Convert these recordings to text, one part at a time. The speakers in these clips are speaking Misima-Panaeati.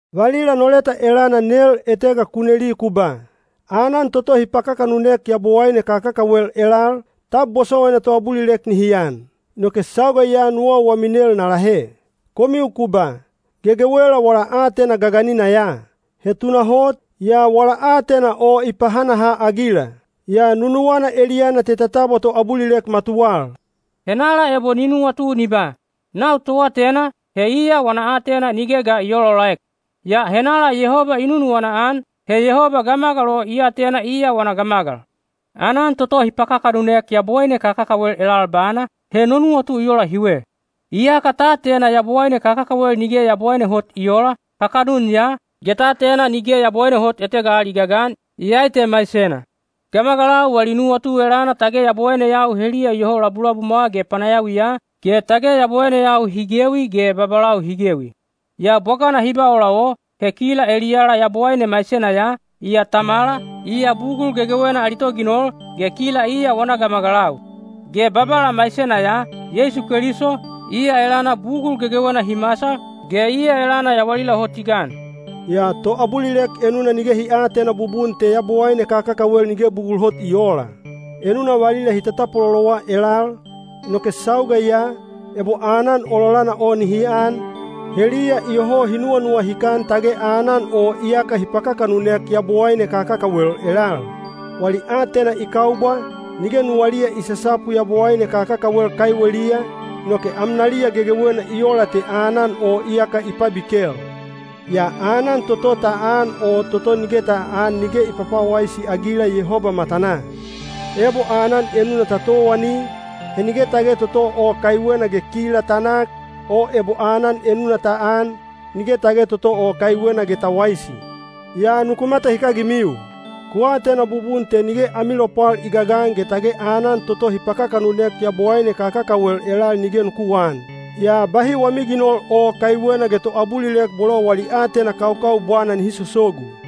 Valila no leta elana nel etega ku neli ku ba, “Aanan toto hi pakakanunek yabowaine kakakawel elal, tab bosowaina toabulilek nihi an?” Inoke sauga ya nuwau wami nel na lahe. Komiu ku ba, “Gegewela wala aatena gaganina ya.” He tunahot, yaa wala aatena o i pahanaha-agila. Yaa nunuwana eliyana te ta tabwa toabulilek matuwal. Henala ebo ni nuwatu ni ba, “Nau toatena,” he iya wana aatena nige ga i oolaolaek. Yaa henala Yehoba i nunuwana-an, he Yehoba gamagal o i atena iya wana gamagal. Aanan toto hi pakakanunek yabowaine kakakawel elal bana, he no nuwatu i ola hiwe. Iyaka ta atena yabowaine kakakawel nige yabowaine hot i oola, kakanun ya, ge ta atena nige Yabowaine hot etega al i gagan, iyai te maisena. Gamagalau wali nuwatu elana tage yabowaineyau heliya iyoho labulabumwa ge panayawiya, ge tage yabowaineyau hi gewi ge babalau hi gewi. Yaa bwagana hi ba ola o, he kila eliyala Yabowaine maisena ya, iya Tamala, iya bugul gegewena ali toginol, ge kila iya wana gamagalau. Ge Babala maisena ya, Yeisu Keliso, iya elana bugul gegewena hi masal, ge iya elana yawalila hot i gan. Yaa toabulilek enuna nige hi aatena bubun te yabowaine kakakawel nige bugul hot i oola. Enuna valila hi tatapwalolowa elal, inoke sauga ya, ebo aanan ololana o nihi an, heliya iyoho hi nuwanuwahikan tage aanan o iyaka hi pakakanunek yabowaine kakakawel elal. Wali aatena i kaubwa, nige nuwaliya i sasapu yabowaine kakakawel kaiweliya, inoke amnaliya gegewena i ola te aanan o iyaka i pabikel. Yaa aanan toto ta an o toto nige ta aan nige i pwapwawaisi-agila Yehoba matanaa. Ebo aanan enuna ta towani, he nige tage toto o kaiwena ge kila ta nak, o ebo aanan enuna ta an, nige tage toto o kaiwena ge ta waisi. Yaa nuku matahikagimiu. Ku atena bubun te nige ami lopwal i gagan ge tage aanan toto hi pakakanunek yabowaine kakakawel elal nige nuku aan. Yaa bahi wami ginol o kaiwena ge toabulilek bolo wali aatena kaukaubwana nihi sosogu.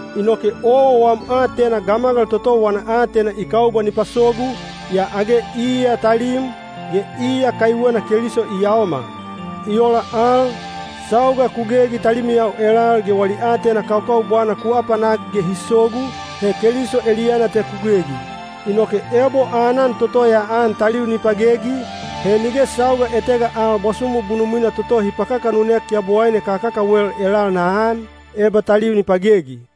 Inoke owa wam aatena gamagal toto wana aatena i kaubwa ni pasogu, yaa age iya talim, ge iya kaiwena Keliso i yaomal. I ola al, sauga ku gegi talimiyau elal ge wali aatena kaukaubwana ku apanak ge hi sogu, he Keliso eliyana te ku gegi. Inoke ebo aanan toto ya an taliu ni pagegi, he nige sauga etega al bwasumu bunumwina toto hi pakakanunek yabowaine kakakawel elal na an, eba taliu na pagegi.